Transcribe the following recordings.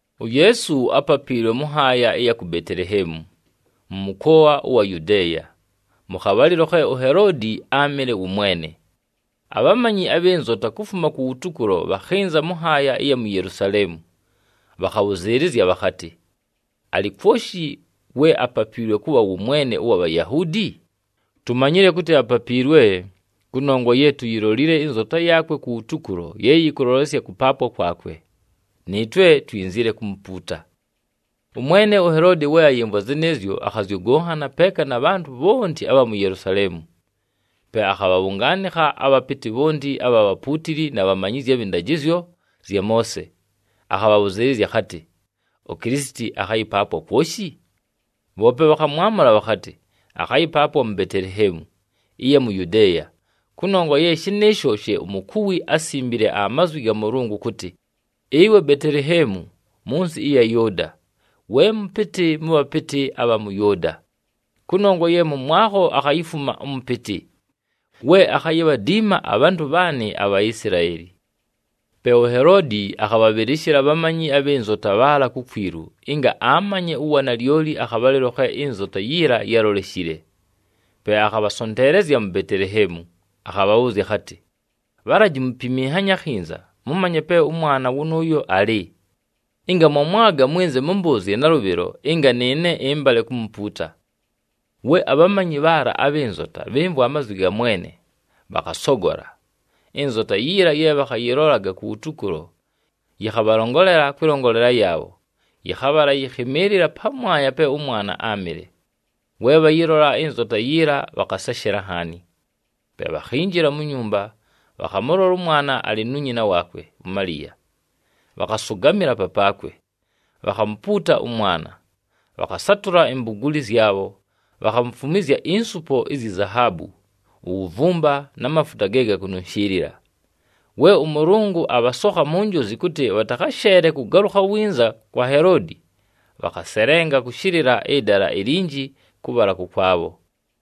UYeesu ápapiilwe mʉ nhaaya ɨya ku Beteleheemu, mʉ mʉkoa ʉwa Yudeeya, mʉ khabhalɨlo khe uHeloodi áamɨle wʉ mwene. Abhamanyi abhɨ nzota kufuma kuwutukulo bhakhɨnza mʉ nhaaya ɨya mu Yelusaleemu. Bhakhabhʉzɨɨlɨzya bhakhatɨ, “Alɨ kwoshi we apapiilwe kʉbha wʉ Mwene ʉwa Bhayahuudi? Tumanyile kʉtɨ apapiilwe, kʉnongwa ye tuyilolile ɨnzota yaakwe kuwutukulo ye yɨkʉlolesya kʉpaapwa kwakwe. Nɨɨtwe twinzile kumupuuta.” Ʉmwene uHeloodi we ayɨmvwa zɨnɨɨzyo, akhazyʉgʉnhana peeka na bhantʉ bhonti abha mu Yelusaleemu. Pe akhabhabhʉngaanɨkha abhapɨtɨ bhonti abha bhapuutili na bhamanyizyi abhɨ ndajɨzyo zya Moose, akhabhabhʉzɨɨlɨzya akhatɨ, “UKilisiti akhayɨpaapwa kwoshi?” Bhoope bhakhamwamʉla bhakhatɨ, “Akhayɨpaapwa mu Beteleheemu, ɨya mu Yudeeya. Kʉnongwa ye shɨnɨɨsho she umukuwi ásimbile amazwi ga Mʉlʉngʉ kʉtɨ, ‘Ɨwe Beteleheemu mʉ nsɨ ɨya Yʉʉda, we mʉpɨtɨ mʉ bhapɨtɨ abha mʉ Yʉʉda, kʉnongwa ye mʉmwakho akhayifuma ʉmʉpɨtɨ, we akhayibhadiima abhantʉ bhaanɨ aBhaisilaeli.’” Pe uHeloodi akhabhabhɨlɨshɨla abhamanyi abhɨ nzota bhaala kukwilu ɨnga amanye uwanalyoli akhabhalɨlo khe ɨnzota yiila yáloleshile. Pe akhabhasonteelezya mu Beteleheemu, akhabhabhʉʉzya akhatɨ, “Bhalaji mupiminhanye akhinza mʉmanye pe ʉmwana wʉnʉʉyo alɨ. Ɨnga mwamwaga, mwɨnze mʉmbʉʉzye nalʉbhɨlo ɨnga nɨɨne ɨmbale kumupuuta.” We abhamanyi bhaala abhɨ nzota bhɨmvwa amazwi ga mwene, bhakhasogola. Ɨnzota yiila ye bhakhayɨlolaga kuwutukulo, yɨkhabhalongolela kwɨlongolela yaabho, yɨkhabhala yɨkhɨmɨɨlɨla pamwanya pe ʉmwana áamɨle. We bhayɨlola ɨnzota yiila, bhakhaseshela nhaani. Pe bhakhinjila mu nyumba, bhakhamʉlola ʉmwana alɨ nu nyina waakwe uMaliya, bhakhasʉgamɨla papaakwe, bhakhamupuuta ʉmwana. Bhakhasatʉla imbuguuli zyabho, bhakhamufumwizya insupo izyi zahaabu, uwuvumba, na mafuta ge gakununshiilila. We ʉMʉlʉngʉ abhasokha mu njozi kʉtɨ bhatakhasheele kʉgalʉkha winza kwa Heloodi, bhakhaselenga kʉshɨlɨla ɨdala ilinji kʉbhala kʉkwabho.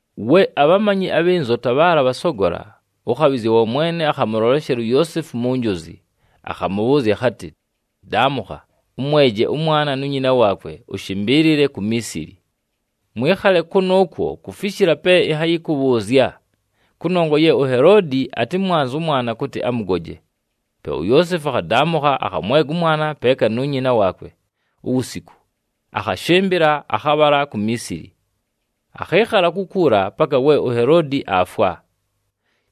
We abhamanyi abhɨ nzota bhaala bhasogola, ʉkhabhɨzya wa Mwene akhamʉloleshela uYoosefu mu njozi, akhamʉbhʉʉzya akhatɨ, “Daamʉkha, ʉmweje ʉmwana nu nyina waakwe, ʉshɨmbɨɨlɨle ku Miisili. Mwɨkhale kʉnʉʉkwo kufishila pe ɨnhayɨkʉbhʉʉzya, kʉnongwa ye uHeloodi atɨmwanze ʉmwana kʉtɨ amʉgoje.” Pe uYoosefu akhadaamʉkha, akhamwega ʉmwana peeka nu nyina waakwe uwusiku, akhashɨmbɨla, akhabhala ku Miisili. Akhɨɨkhala kukuula paka we uHeloodi aafwa.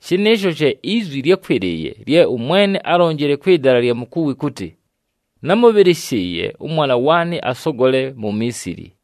Shɨnɨɨsho she izwi lyákwɨlɨɨye lye ʉMwene álonjile kwɨ dala ɨlya mukuwi kʉtɨ, “Námʉbhɨlɨshɨɨye ʉmwana waanɨ asogole mu Miisili.”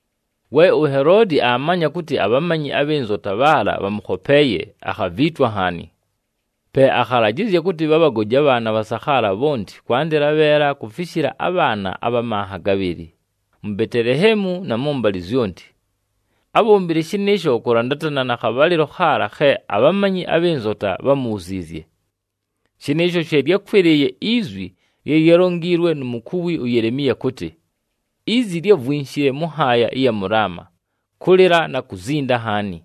We uHeloodi aamanya kʉtɨ abhamanyi abhɨ nzota bhaala bhamʉkhopeeye, akhaviitwa nhaani. Pe akhalajɨzya kʉtɨ bhabhagoje abhaana abhasakhaala bhonti kwandɨla abheela kufishila abhaana abha manha gabhɨlɨ, mu Beteleheemu na mʉmbalɨ zyonti. Ábhombile shɨnɨɨsho kʉlandatana na khabhalɨlo khaala khe abhamanyi abhɨ nzota bhámubhuziizye. Shɨnɨɨsho she lyákwɨlɨɨye izwi lye lyálonjiilwe nu mukuwi uYelemiya kʉtɨ, “Izi lyávwinshile mʉ nhaaya ɨya mʉ Laama, kʉlɨla na kuzinda nhaani.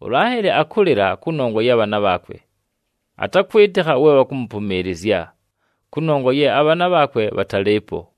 ULaheli akʉlɨla kʉnongwa ya bhaana bhaakwe, atakwɨtɨkha we bhakʉmʉpʉmɨɨlɨzya, kʉnongwa ye abhaana bhaakwe bhatalɨɨpo.”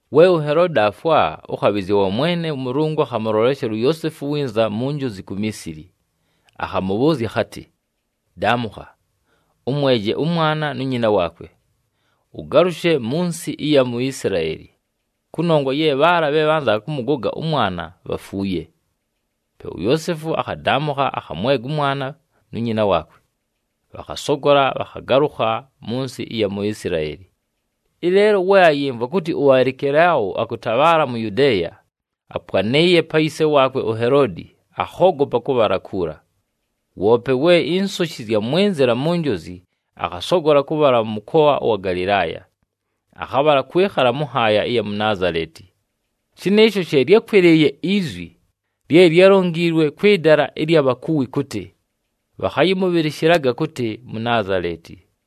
We uHeloodi aafwa, ʉkhabhɨzya wa Mwene ʉMʉlʉngʉ akhamʉloleshela uYoosefu winza mu njozi ku Miisili, akhamʉbhʉʉzya akhatɨ, “Daamʉkha, ʉmweje ʉmwana nu nyina waakwe, ʉgalʉshe mʉ nsɨ ɨya mu Isilaeli kʉnongwa ye bhaala bhe bhanzaga kʉmʉgoga ʉmwana bhafuuye.” Pe uYoosefu akhadaamʉkha, akhamwega ʉmwana nu nyina waakwe, bhakhasogola, bhakhagalʉkha mʉ nsɨ ɨya mu Isilaeli. Ɨleelo we ayɨmvwa kʉtɨ uAlikelao akʉtabhaala mu Yudeeya, apwanɨɨye pa yise waakwe uHeloodi, akhoogopa kʉbhala kuula. Woope we insoshi zyamwɨnzɨla mu njozi, akhasogola kʉbhala mʉ mʉkoa ʉwa Galɨlaaya, akhabhala kwɨkhala mʉ nhaaya ɨya mu Naazaleti. Shɨnɨɨsho she lyákwɨlɨɨye izwi lye lyálonjiilwe kwɨ dala ɨlya bhakuwi kʉtɨ, “Bhakhayɨmʉbhɨlɨshɨlaga kʉtɨ Munaazaleti.”